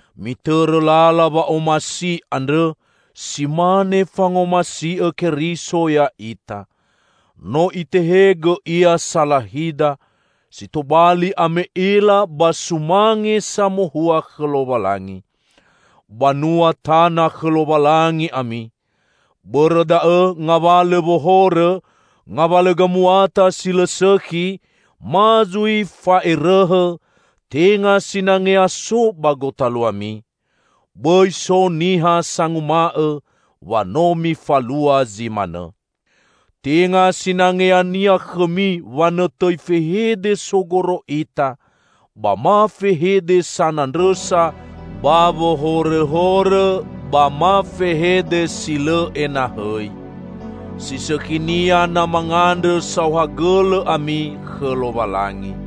Mitõrõ lala wa'omasi andrõ, si mane fangomasi'õ Keriso ya'ita. No Itehegõ Ia salahida, si tobali ame'ela ba sumange samohua khõ Lowalangi. Banua tana khõ Lowalangi ami. Bõrõ da'õ, ngawalõ wohorõ, ngawalõ gamuata si lõ sõkhi, ma zui fa'erõhõ, tenga sinangea so ba gotaluami. Bõi so niha sanguma'õ wa no mifalua zi manõ. Tenga sinangeania khõmi wanõtõi fehede sogoro ita, ba ma fehede sanandrõsa ba wohorõhorõ, ba ma fehede si lõ enahõi. Si sõkhinia na mangandrõ saohagõlõ ami khõ Lowalangi.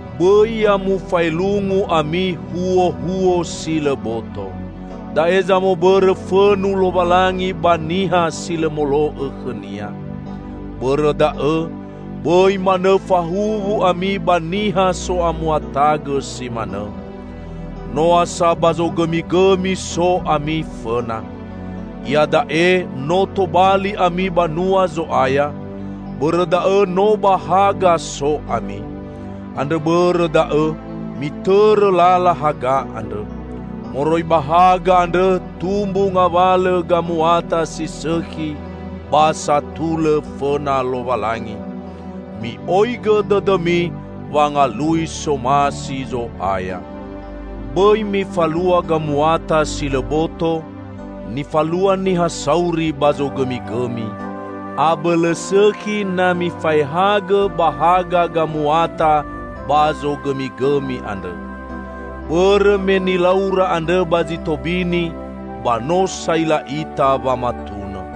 Bõi ya mufaelungu ami huohuo si lõ boto. Da'e zamobõrõ fõnu Lowalangi ba niha si lõ molo'õ khõ-Nia. Bõrõ da'õ, bõi manõ fahuwu ami ba niha so'amuatagõ si manõ. Noa sa ba zogõmigõmi so ami fõna. Iada'e no tobali ami banua Zo'aya, bõrõ da'õ no ba haga so ami. Andrõ bõrõ da'õ mitõrõ lala haga andrõ. Moroi ba haga andrõ tumbu ngawalõ gamuata si sõkhi ba satulõ fõna Lowalangi. Mi'oigõ dõdõmi wangalui somasi Zo'aya. Bõi mifalua gamuata si lõ boto, nifalua niha sauri ba zogõmigõmi. Abõlõ sõkhi na mifaehagõ ba haga gamuata ba zogõmigõmi andrõ. (Bõrõ me nilaura andrõ ba zi tobini, ba no saila ita wamatunõ.)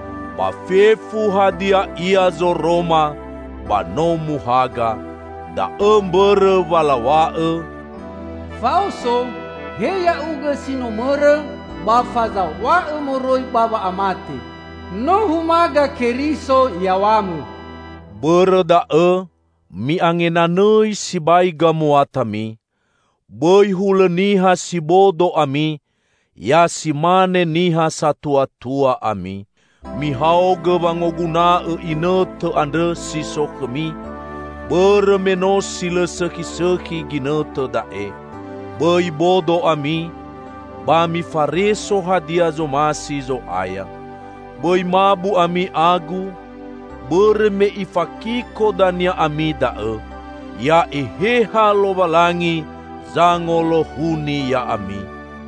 Ba fefu hadia ia zoroma, ba no muhaga. Da'õ mbõrõ wa law̃a'õ, "Faoso, he ya'ugõ si no mõrõ, ba fazaw̃a'õ moroi ba wa'amate! No humaga Keriso yaw̃amõ." Bõrõ da'õ, mi'angenanõi sibai gamuatami. Bõi hulõ niha si bodo ami; ya si mane niha satuatua ami. Mihaogõ wangoguna'õ inõtõ andrõ si so khõmi, bõrõ me no si lõ sõkhisõkhi ginõtõ da'e. Bõi bodo ami, ba mifareso hadia zomasi Zo'aya. Bõi mabu ami agu, bõrõ me ifakiko dania ami da'õ. Ya Eheha Lowalangi zangolohuni ya'ami.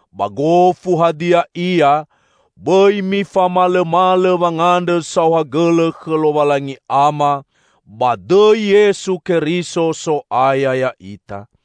Ba gofu hadia ia, bõi mifamalõmalõ wangandrõ saohagõlõ khõ Lowalangi Ama, ba dõi Yesu Keriso, So'aya ya'ita.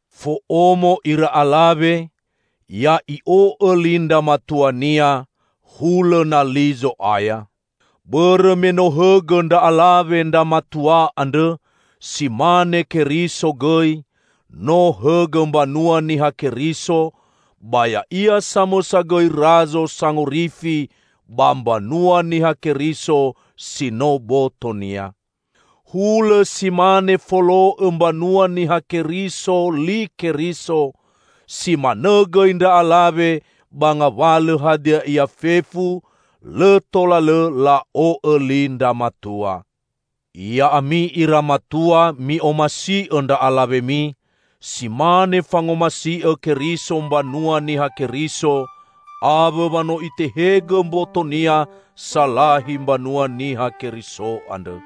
Fo'omo ira alawe, ya'i'o'õ li ndra matuania, hulõ na li Zo'aya. Bõrõ me no hõgõ ndra alawe ndra matua andrõ, si mane Keriso gõi, no hõgõ mbanua Niha Keriso, ba Ya'ia samõsa gõi Razo Sangorifi ba mbanua Niha Keriso, si no boto-Nia. Hulõ si mane folo'õ mbanua Niha Keriso li Keriso, si manõ gõi ndra alawe ba ngawalõ hadia ia fefu, lõ tola lõ la'o'õ li ndra matua. Ya'ami ira matua, mi'omasi'õ ndra alawemi, si mane fangomasi'õ Keriso mbanua Niha Keriso, awõ wa no Itehegõ mboto-Nia salahi mbanua Niha Keriso andrõ.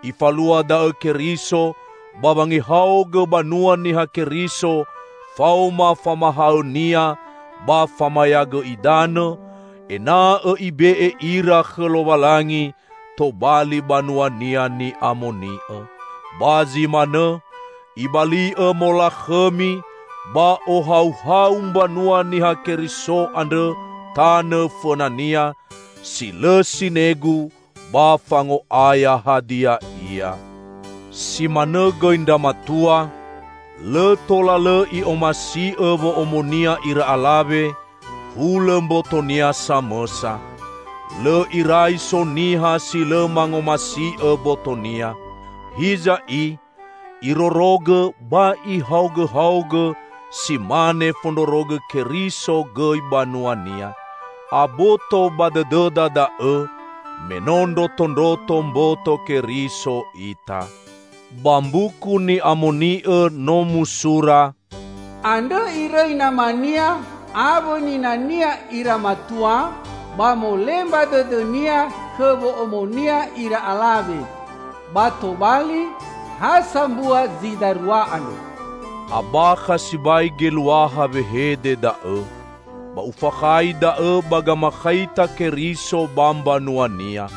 Ifalua da'õ Keriso ba wangehaogõ banua Niha Keriso faoma famahaõ-Nia ba famayagõ idanõ, ena'õ Ibe'e ira khõ Lowalangi, tobali banua-Nia ni'amoni'õ. Ba zi manõ, Ibali'õ molakhõmi ba ohauhau mbanua Niha Keriso andrõ tanõ fõna-Nia, si lõ sinegu ba fango'aya hadia ia. Si manõ gõi ndra matua, lõ tola lõ i'omasi'õ wo'omonia ira alawe, hulõ mbotonia samõsa. (Lõ irai so niha si lõ mangomasi'õ botonia. Hiza i, irorogõ ba ihaogõhaogõ, si mane fondrorogõ Keriso gõi banua-Nia. Aboto ba dõdõda da'õ, me no ndrotondroto mboto Keriso ita.) Ba Mbuku Ni'amoni'õ no musura, "Andrõ irõi namania awõ ninania ira matua, ba molemba dõdõnia khõ wo'omonia ira alawe, ba tobali ha sambua zi darua andrõ." Abakha sibai geluaha wehede da'õ. Ba ufakhai da'õ ba gamakhaita Keriso ba mbanua-Nia.